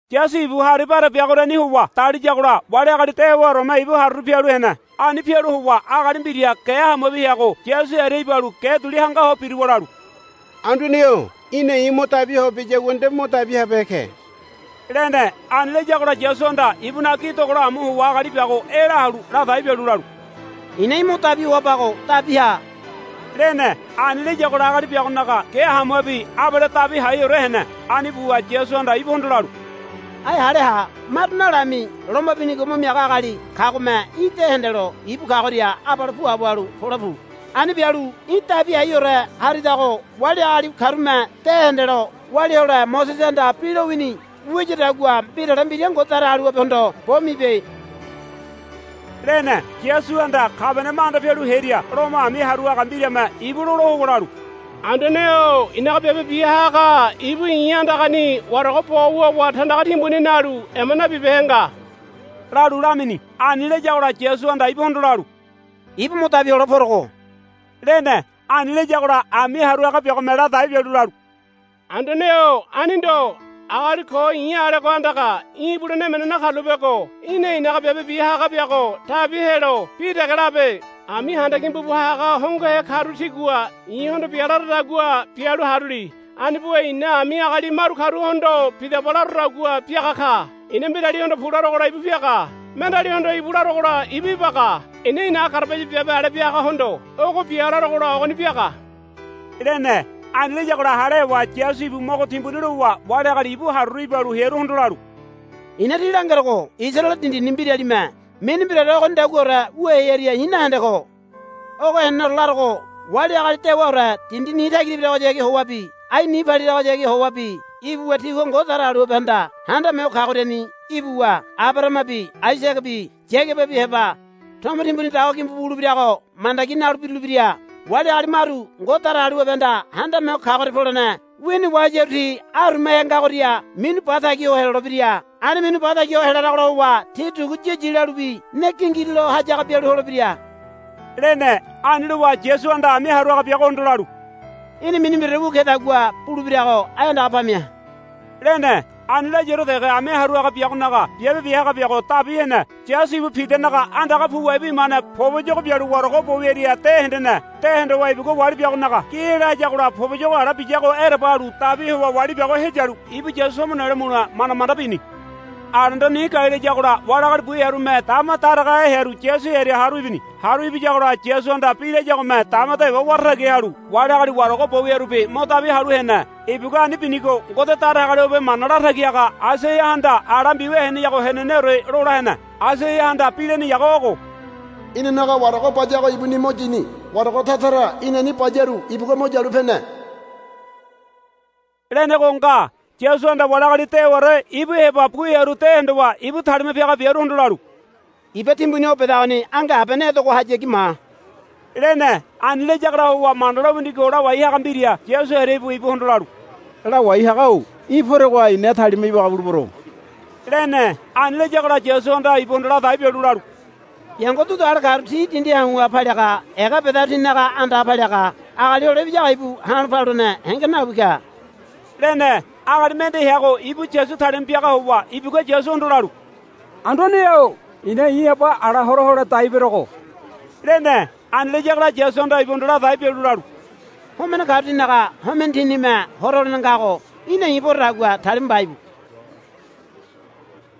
Yasu ibu hari bare biagoriani howa daliyagola wali agali dewaoreme ibu haruru pialu hene. Ani pialu howa agali mbira ge hamuabi heago Yasu hearia ibalu ge duli hanga ho biruwa lalu, Anduane-o í̠na i̱ mo dabi hoa biyagua nde mo dabi habehe ke, lene. Ani layagola Yasuhanda ibunaga gi dogola amu howa agali biago ela halu ladai bialu lalu, I̱na í̠ mo dabi hoabago dabi ha, lene. Ani layagola agali biagonaga ge hamuabi abale dabi haiore hene. Ani buwa Yasuhanda ibuhondo lalu, Ai hale ha. Maru nalami loma binigo mo miaga agali kagome í̠ de hendelo ibu kagoria abale puabo halu pole pu. Ani bialu í̠ dabi haiore haridago wali agali karume de hendelo walia hole Mosesehanda bi lowini wiyadagua mbirale mbira Ngode Datagaliwabehondo bo mibe, lene. Yasuhanda Kabaniama anda pialu hearia Lomo ami haru haga mbirame ibu lola howa lalu, Anduane-o i̱naga biabe bia haga ibu i̱ andagani warago bo wuwa tandaga timbuni nalu ema nabibehe nga, lalu lamini. Ani layagola Yasuhanda ibuhondo lalu, Ibu mo dabi hole porogo, lene. Ani layagola ami haru biagome ladai bialu lalu, Anduane-o ani ndo. Agali ko i̱ alego andaga í̠ ibulene emene nakarulapego í̠na i̱naga biabe bia haga biago dabi helo bi dege labe. Ami handa gimbu bu haga hongohe karu tigua i̱hondo, Bia, laradagua bialu haruli. Ani buwa i̱na ani agali maru karuhondo, Bidaba, larodagua biaga ka. I̱na mbiralihondo, Pu, larogola ibu piaga. Mendealihondo, Íbu, larogola ibu ibaga. I̱na i̱naga garabaya biabe ale bia hagahondo, Ogo bia, larogola ogoni biaga, lene. Ani layagola hale howa Yasu ibu mogo timbuni lowa wali agali ibu haruru ibalu hearuhondo lalu, I̱na tí langerogo Isaraele dindini mbiralime mini mbiraore ogonidaguaore wu hearia i̱ nahende ko. Ogo heneneore larogo wali agali dewaore dindi ni tagira ibiragohayagi howabi ai ni paliragohayagi howabi ibuwa tigua Ngode Datagaliwabehanda Handame Ho Kagoriani ibuwa Abarahamabi Aisagabi Yagababi heba tomo timbuni dawa gimbu bu wulebirago mandagi nalu birulebira. Wali agali maru Ngode Datagaliwabehanda Handame Ho Kagoria polene wini wahayaru ti arumahe ngagoria minu ba tagi ho helolebira. Ani minu ba tagi ho helaragola howa ti dugu yiyi lalubi ne gingirulo hayaga bialu holebira, lene. Ani lowa Yasuhanda ami haru haga biagohondo lalu, Í̠na mini mbiraore wu kedagua bulebirago ai andaga pamia, lene. Ani layaore dege ami haru haga biagonaga biabe bia haga biago dabi hene. Yasu ibu Pidanaga andaga puwa ibu imane poboyogo bialu warago bo wiaria de hendeme. De hondowa ibugua wali biagonaga gi ela hayagola poboyogo ala biyago ereba halu dabi howa wali biago heyalu ibu Yasu tomo nelo mule manda manda bini. Alendo ni gai layagola wali agali bu hearume dama daragahe hearu Yasu hearia haru ibini. Haru ibiyagola Yasuhanda bi layagome dama dewa wara tagi halu wali agali warago bo wiarubi mo dabi halu hene. Ibugua ani binigo Ngode Datagaliwabe mana latagi haga Aisaiahanda ala mbiwia heneyago heneneore lola hene. Aisaiahanda bi leneyago ogo, Inanaga warago bayago ibuni mo yini. Warago tara tara inani bayaru ibugua mo yalu pene, lenego nga. Yasuhanda wali agali dewarore ibu heba bu hearu de hondowa ibu talima piaga biaruhondo lalu, Iba timbuni o bedagoni ange abene edegohayagi ma, lene. Ani layagola howa Mana lowinigo lawai haga mbira Yasu hearia ibuwa ibuhondo lalu, Lawai haga-o í̠ poregoha i̱na talima ibaga bulebero, lene. Ani layagola Yasuhanda ibuhondo ladai bialu lalu, Biango dudu ale karu ti dindi hau̱ha paliaga ega bedaru tinaga andaha paliaga Agali Hole Ibiyago ibu ha̱lo̱ paluene henge nawi ka, lene. Agali mende heago ibu Yasu talima piaga howa ibugua Yasuhondo lalu, Anduane-o i̱na i̱ aba ala hora hole dai berogo, lene. Ani layagola Yasuhanda ibuhondo ladai bialu lalu, Homene karu tinaga homene tinime hora holene ngago í̠na i̱ porodagua talima mba íbu,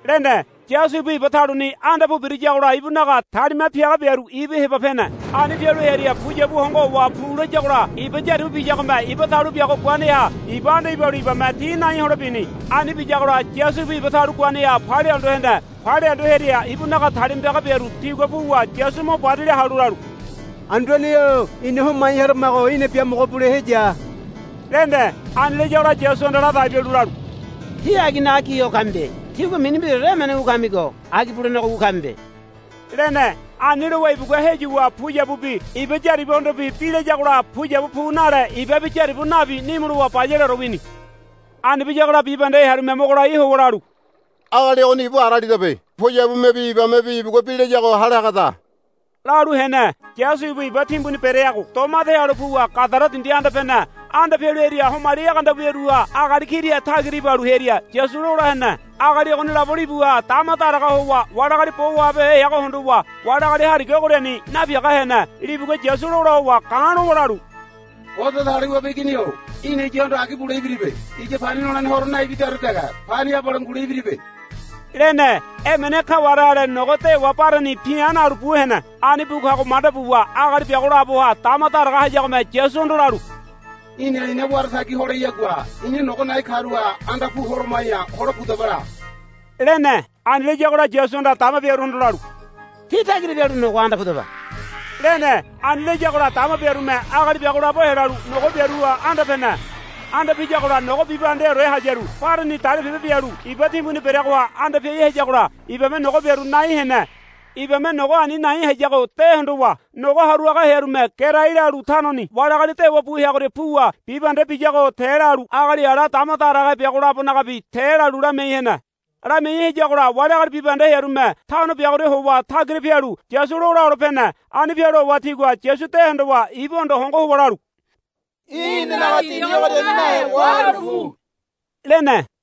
lene. Yasu ibu iba taluni anda pu birayagola ibunaga talima piaga biaru ibu heba pene. Ani pialu hearia puyabu hongo howa pu layagola iba yaribu biyagome iba talu biago guaneha iba anda ibalu ibame ti nai hole bini. Ani biyagola Yasu ibu iba talu guaneha palia hondo hene. Palia hondo hearia ibunaga talima piaga biaru tigua puwa Yasu mo barila halu lalu, Anduane-o ina homai haramago í̠na biamogo bule heya, lene. Ani layagola Yasuhanda ladai bialu lalu, Tí aginaga gi ho kamibe. Tígua mini mbiraore emene wu kamigo agi bulenego wu kamibe, lene. Ani lowa ibugua heyuwa puyabubi iba yaribuhondobi bi layagola puyabu nale ibabi yaribu nabi nimu lowa bayaleore wini. Ani biyagola bibahende hearume mogo lai howa lalu, Agali ogoni ibu ara alidabe. Puyabumebi ibamebi ibugua bi layago hale hagada, lalu hene. Yasu ibu iba timbuni bereago doma ede halu puwa Gadara dindi anda pene. Anda pialu hearia homali egeanda wiaruha agali kira tagira ibalu hearia Yasu lola hene. Agali ogoni labo libuha dama daraga howa wali agali bo wahabehe heago hondowa wali agali hariga ogoriani napiaga hene. Libugua Yasu lola howa ga̱ lowa lalu, Ngode Datagaliwabe Igini-o í̠na iyahondo agi bule ibiribe. Iya pani nolene horo naibidaore dege pani abale ngule ibiribe, lene. Emene kaware ale nogo dewa bareni pi̱a̱ nalu bu hene. Ani bu kago manda buwa agali biago laboha dama daraga hayagome Yasuhondo lalu, Í̠na ina wara tagi holeyagua ina nogo na̱i̱ karuha anda pu holoma̱ya hole pudaba la, lene. Ani layagola Yasuhanda dama biaruhondo lalu, Tí tagira pialu nogoha anda pudaba, lene. Ani layagola dama biarume agali biago labo helalu nogo biaruha anda pene. Anda piyagola nogo bibahendeore hayaru bareni dalipebe bialu iba timbuni bereagoha anda piai hayagola ibame nogo biaru nai hene. Ibame nogo ani nai hayago de hondowa nogo haru haga hearume gerai lalu tanoni wali agali dewa bu heagoria puwa bibahende biyago te lalu agali ala dama daragahe biago labonagabi te lalu lamiai hene. Lamiai hayagola wali agali bibahende hearume tano biagoria howa tagira pialu Yasu lola hole pene. Ani pialu howa tigua Yasu de hondowa ibuhondo hongo howa lalu, Í̠ inanaga dindi ogoriani nahe wahalu pu, lene.